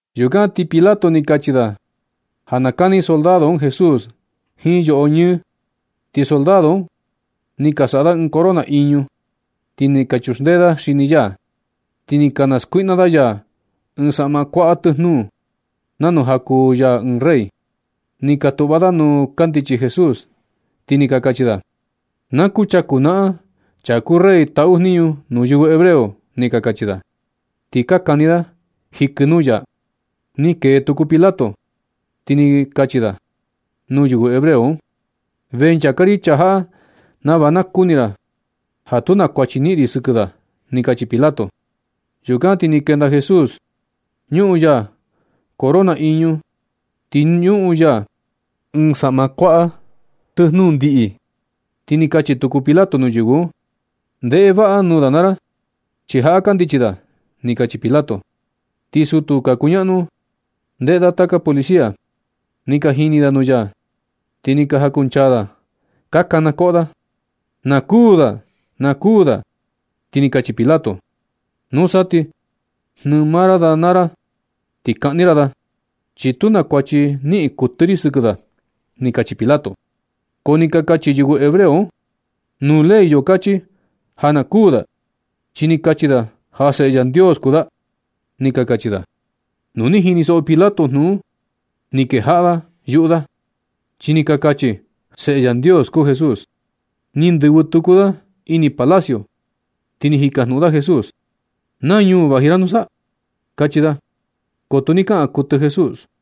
Yukan ti Pilato ni kachi da ja na kani soldado un Jesús jiin yoꞌo ñɨɨ. Ti soldado un ni ka saꞌa da ɨɨn corona iñu, ti ni ka chuxndee da xini ya. Ti ni ka naskuiꞌna da ya ɨɨn saꞌma kuaꞌa tɨjnuu, nanu ja kuu ya ɨɨn rey. Ni ka tuꞌva da nuu kandichi Jesús, ti ni ka kachi da: ―Na kuchaku naꞌan chaa kuu rey taꞌu jniñu nuu yɨvɨ hebreo ―ni ka kachi da. Ti ka kani da xiɨkɨ nuu ya. Ni kee tuku Pilato, ti ni kachi da nuu yɨvɨ hebreo un: ―Vee nchaka ri chaa jaꞌa nava na kuni ra ja tu na kuachi niꞌin ri sɨkɨ da ―ni kachi Pilato. Yukan ti ni kenda Jesús. Ñuꞌun ya corona iñu ti ñuꞌun ya ɨɨn saꞌma kuaꞌa tɨjnuu ndiꞌi. Ti ni kachi tuku Pilato nuu yɨvɨ un: ―Ndeꞌe vaꞌa nuu da naa ra, chi jaꞌa kandichi da ―ni kachi Pilato. Ti sutu ka kuñaꞌnu ndeꞌe da taka policía, ni ka jini da nuu ya, ti ni ka jakunchaa da ka kanakoꞌo da: ―¡Na kuū da! ¡Na kuū da! Ti ni kachi Pilato: ―Nusa ti jnɨɨ maa ra da naa ra ti kaꞌni ra da, chi tu na kuachi niꞌin kuɨtɨ ri sɨkɨ da ―ni kachi Pilato. Ko ni ka kachi yɨvɨ hebreo un: ―Nuu ley yo kachi ja na kuū da, chi ni kachi da ja Seꞌe Yandios kuu da ―ni ka kachi da. Nu ni jinisoꞌo Pilato jnuꞌun un ni kejaꞌa yuꞌu da, chi ni ka kachi ja yɨvɨ un Seꞌe Yandios kuu Jesús. Ni ndɨvɨ tuku da ini palacio, ti ni jikajnuꞌun da Jesús: ―¿Na ñuu vaji ra nusa? ―kachi da. Ko tu ni kaꞌan kuɨtɨ Jesús.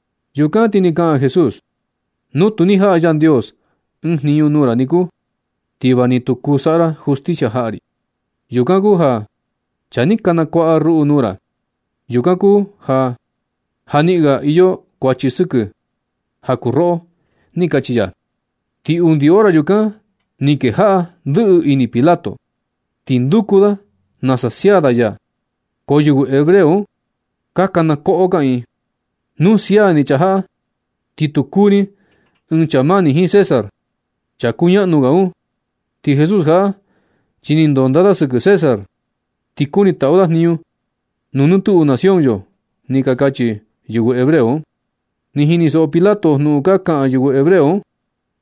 Yukan ti ni kaꞌan Jesús: ―Nu tu ni jaꞌa Yandios ɨɨn jniñu nuu ra niku, ti va ni tu kuu saꞌa ra justicia jaꞌa ri. Yukan kuu ja chaa ni ka nakuaꞌa ruꞌu nuu ra, yukan kuu ja ja niꞌin ga ka iyo kuachi sɨkɨ ja kuu roꞌo ―ni kachi ya. Ti undi hora yukan ni kejaꞌa ndɨꞌɨ ini Pilato ti nduku da nasa sia da ya. Ko yɨvɨ hebreo un ka kana koꞌo kaꞌiin: ―¡Nu sia ni chaa jaꞌa, ti tu kuu ni ɨɨn chaa mani jiin César, chaa kuñaꞌnu ga un! Ti Jesús jaꞌa, chi ni ndonda da sɨkɨ César, ti kuni taꞌu da jniñu nuu nɨ tuꞌu nacion yo ―ni ka kachi yɨvɨ hebreo un. Ni jinisoꞌo Pilato jnuꞌun ka kaꞌan yɨvɨ hebreo un,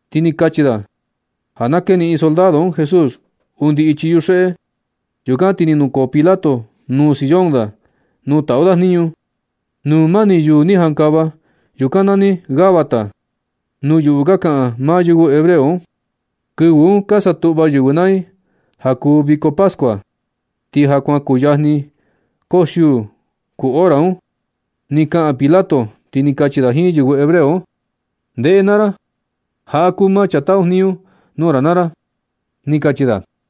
ti ni kachi da ja na keniꞌin soldado un Jesús undi ichi yuxeꞌe. Yukan ti ni nukoo Pilato nuu sillón da nuu taꞌu da jniñu, nuu mani yuu ni jankava. Yukan nani Gabata nuu yuꞌu ka kaꞌan maa yɨvɨ hebreo un. Kɨvɨ un ka satuꞌva yɨvɨ naa i ja kuu viko pascua, ti ja kuan kuyajni koxiuu kuu hora un. Ni kaꞌan Pilato ti ni kachi da jiin yɨvɨ hebreo un: ―¡Ndeꞌe naa ra! Jaꞌa kuu maa chaa taꞌu jniñu nuu ra naa ra ―ni kachi da.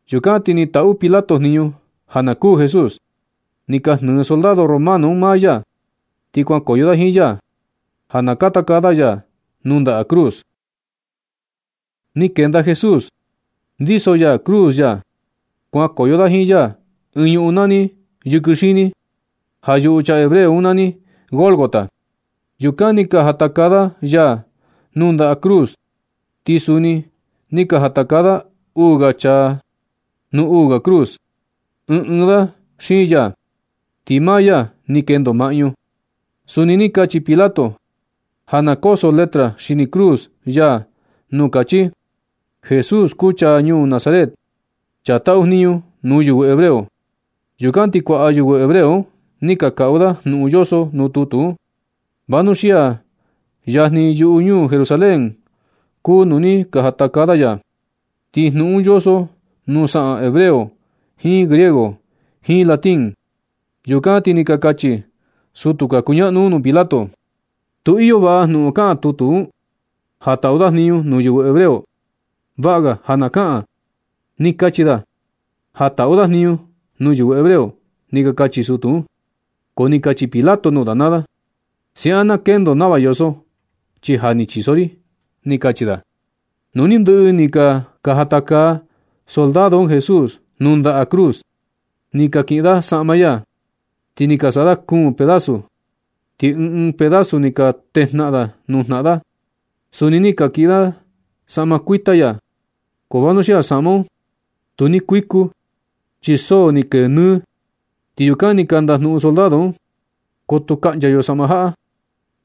Yukan ti ni taꞌu Pilato jniñu ja na kuū Jesús. Ni ka jnɨɨ soldado romano un maa ya ti kuankoyo da jiin ya, ja na katakaa da ya nuu ndaꞌa cruz. Ni kenda Jesús, ndiso ya cruz ya. Kuankoyo da jiin ya ɨɨn ñuꞌun nani “Yɨkɨ Xini”, ja yuꞌu chaa hebreo un nani Gólgota. Yukan ni ka jatakaa da ya nuu ndaꞌa cruz. Ti suni ni ka jatakaa da uu ga chaa nuu uu ga cruz, ɨɨn ɨɨn da xiin ya, ti maa ya ni kendo maꞌñu. Suni ni kachi Pilato ja na koso letra xini cruz ya nuu kachi: “Jesús, kuu chaa ñuu Nazaret, chaa taꞌu jniñu nuu yɨvɨ hebreo.” Yukan ti kuaꞌa yɨvɨ hebreo un ni ka kaꞌu da jnuꞌun yoso nuu tutu un, vanuxia yajni yuꞌu ñuu Jerusalén kuu nuu ni ka jatakaa da ya. Ti jnuꞌun un yoso nuu saꞌan hebreo, jiin griego jiin latín. Yukan ti ni ka kachi sutu ka kuñaꞌnu un nuu Pilato: ―Tu iyo vaꞌa jnuꞌun kaꞌan tutu un, ja taꞌu da jniñu nuu yɨvɨ hebreo. Vaꞌa ga ja na kaꞌan: “Ni kachi da ja taꞌu da jniñu nuu yɨvɨ hebreo” ―ni ka kachi sutu un. Ko ni kachi Pilato nuu da naa da: ―Siaꞌan na kendo nava yoso, chi ja ni chiso ri ―ni kachi da. Nu ni ndɨꞌɨ ni ka jatakaa soldado un Jesús nuu ndaꞌa cruz, ni ka kiꞌin da saꞌma ya, ti ni ka saꞌa da kuun pedazu. Ti ɨɨn ɨɨn pedazu ni ka tejnaꞌan nuu jnaꞌan da. Suni ni ka kiꞌin da saꞌma kuita ya. Ko vanuxia saꞌma un tu ni kuiku, chi so ni kee nɨ. Ti yukan ni ka ndajnuꞌun soldado un: ―Ko tu kaꞌncha yo saꞌma jaꞌa,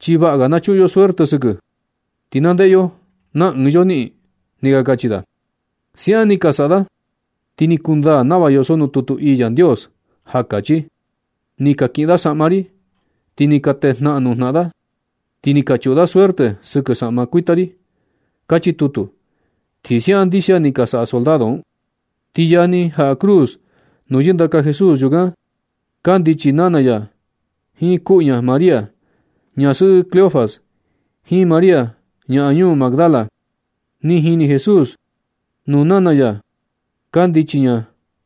chi vaꞌa ga na chuꞌun yo suerte sɨkɨ, ti na ndeꞌe yo na ɨɨn yo niꞌin ―ni ka kachi da. Siaꞌan ni ka saꞌa da, ti ni kundaa nava yoso nuu tutu ii Yandios, ja kachi: “Ni ka kiꞌin da saꞌma ri ti ni ka tejnaꞌan nuu jnaꞌan da. Ti ni ka chuꞌun da suerte sɨkɨ saꞌma kuita ri”, kachi tutu. Ti siaꞌan ndixia ni ka saꞌa soldado un. Ti yajni jaꞌa cruz nuu yɨndaka Jesús, yukan kandichi nana ya, jiin kuꞌu ña María, ñasɨꞌɨ Cleofas, jiin María ñaꞌan ñuu Magdala. Ni jini Jesús nuu nana ya kandichi ña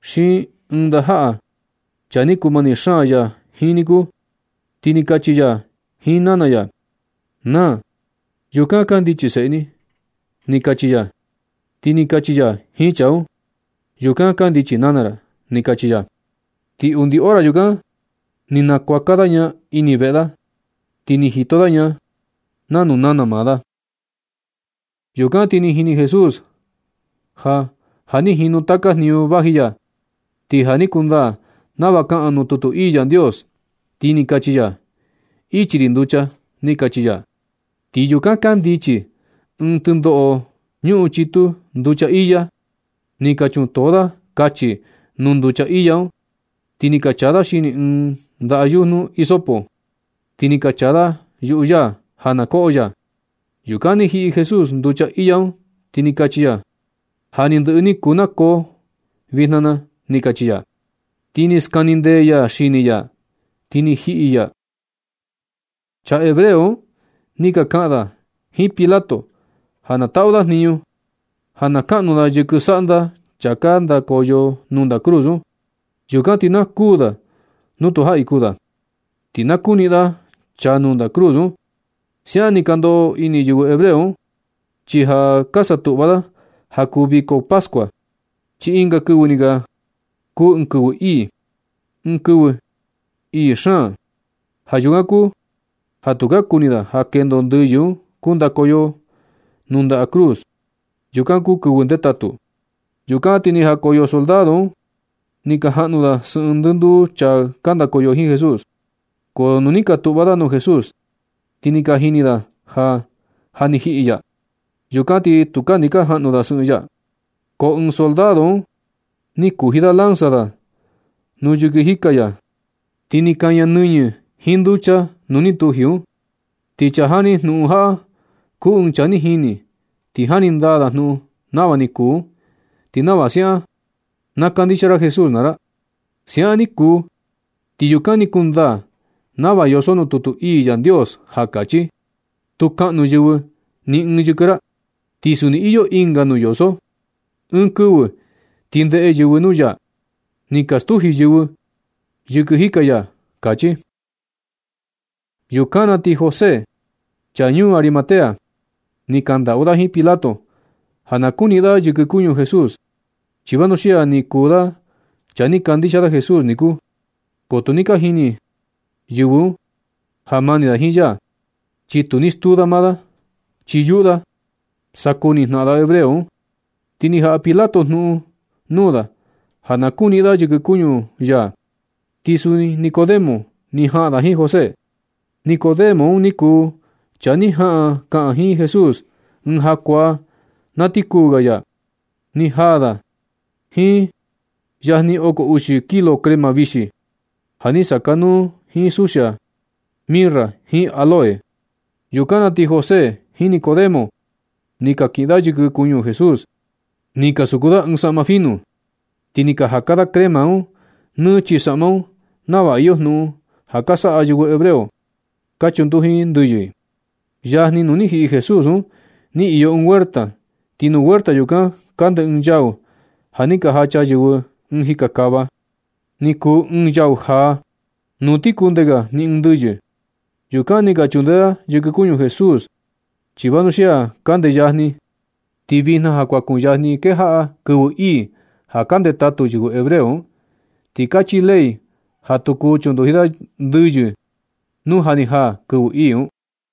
xiin ɨɨn ndajaꞌa, chaa ni kuu mani xaan ya jiin niku. Ti ni kachi ya jiin nana ya: ―Naa, yukan kandichi seꞌe ni ―ni kachi ya. Ti ni kachi ya jiin chaa un: ―Yukan kandichi nana ra ―ni kachi ya. Ti undi hora yukan ni nakuaka da ña ini veꞌe da, ti ni jito da ña nanu nana maa da. Yukan ti ni jini Jesús ja ja ni jinu taka jniñu vaji ya, ti ja na kundaa nava kaꞌan nuu tutu ii Yandios. Ti ni kachi ya: ―Ichi ri nducha ―ni kachi ya. Ti yukan kandichi ɨɨn tɨndoꞌo, ñuꞌun chitu nducha iya. Ni ka chuntoo da kachi nuu nducha iya un, ti ni ka chaa da xini ɨɨn ndaꞌa yujnu hisopo, ti ni ka chaa da yuꞌu ya ja na koꞌo ya. Yukan ni jiꞌi Jesús nducha iya un, ti ni kachi ya: ―Ja ni ndɨꞌɨ ni kuu nakoo vijna na ―ni kachi ya. Ti ni skanindee ya xini ya, ti ni jiꞌi ni ya. Chaa hebreo un ni ka kaꞌan da jiin Pilato ja na taꞌu da jniñu, ja na kaꞌnu da yɨkɨ saꞌnda chaa ka ndakoyo nuu ndaꞌa cruz un. Yukan ti na kuu da nu tu jaꞌi kuu da, ti na kuniꞌin da chaa nuu ndaꞌa cruz un. Siaꞌan ni ka ndoꞌo ini yɨvɨ hebreo un, chi ja ka satuꞌva da ja kuu viko pascua, chi ɨnga kɨvɨ ni ga kuu ɨɨn kɨvɨ ii, ɨɨn kɨvɨ ii xaan ga. Ja yukan kuu ja tu ka kuni da ja kendo ndɨyɨ un kundakoyo i nuu ndaꞌa cruz yukan kuu kɨvɨ ndetatu. Yukan ti ni jakoyo soldado un ni ka jaꞌnu da sɨꞌɨn ndɨnduu chaa ka ndakoyo jiin Jesús. Ko nu ni ka tuꞌva da nuu Jesús, ti ni ka jini da ja, ja ni jiꞌi ya. Yukan ti tu ni ka jaꞌnu da sɨꞌɨn ya. Ko ɨɨn soldado un ni kuji da lanza da nuu yɨkɨ jika ya, ti ni kaña nɨñɨ jiin nducha nuu ni tuji un. Ti chaa jani jnuꞌun jaꞌa kuu ɨɨn chaa ni jini, ti jani ndaa da jnuꞌun nava ni kuu un, ti nava siaꞌan na kandixia ra Jesús naa ra. Siaꞌan ni kuu, ti yukan ni kundaa nava yoso nuu tutu ii Yandios, ja kachi: “Tu kaꞌnu yɨvɨ ni ɨɨn yɨkɨ ya.” Ti suni iyo ɨnga nuu yoso: “Ɨɨn kɨvɨ ti ndeꞌe yɨvɨ nuu ya ni ka stuji yɨvɨ yɨkɨjika ya”, kachi. Yukan na ti José, chaa ñuu Arimatea, ni kandaꞌu da jiin Pilato ja na kuniꞌin da yɨkɨ kuñu Jesús. Chi vanuxia ni kuu da chaa ni kandixia Jesús niku. Ko tu ni ka jini yɨvɨ un ja mani da jiin ya, chi tu ni stuu da maa da, chi yuꞌu da sa kuni jnaꞌan da hebreo un. Ti ni jaꞌa Pilato jnuꞌun nuu da ja na kuniꞌin da yɨkɨ kuñu ya. Ti suni Nicodemo ni jaꞌan da jiin José. Nicodemo un ni kuu chaa ni jaꞌan kaꞌan jiin Jesús ɨɨn jakuaa na ti kuu ga ya. Ni jaa da jiin yajni oko uxi kilo crema vixi, ja ni sakanuu jiin suxia mirra jiin áloe. Yukan na ti José jiin Nicodemo, ni ka kiꞌin da yɨkɨ kuñu Jesús, ni ka suku da jiin saꞌma finu, ti ni ka jaka da crema un nɨ chii saꞌma un nava iyo jnuꞌun ja ka saꞌa yɨvɨ hebreo, ka chunduji i ndɨyɨ i. Yajni nuu ni jiꞌi Jesús un ni iyo ɨɨn huerta, ti nuu huerta yukan, kande ɨɨn yau ja ni ka jacha yɨvɨ ɨɨn jika xaꞌva. Ni kuu ɨɨn yau jaa, nuu ti kunde ga ni ɨɨn ndɨyɨ. Yukan ni ka chundee da yɨkɨ kuñu Jesús, chi vanuxia kande yajni, ti vijna ja kuan kuyajni kejaꞌa kɨvɨ ii ja ka ndetatu yɨvɨ hebreo un. Ti kachi ley ja tu kuu chunduji da ndɨyɨ nuu ja ni jaa kɨvɨ ii un.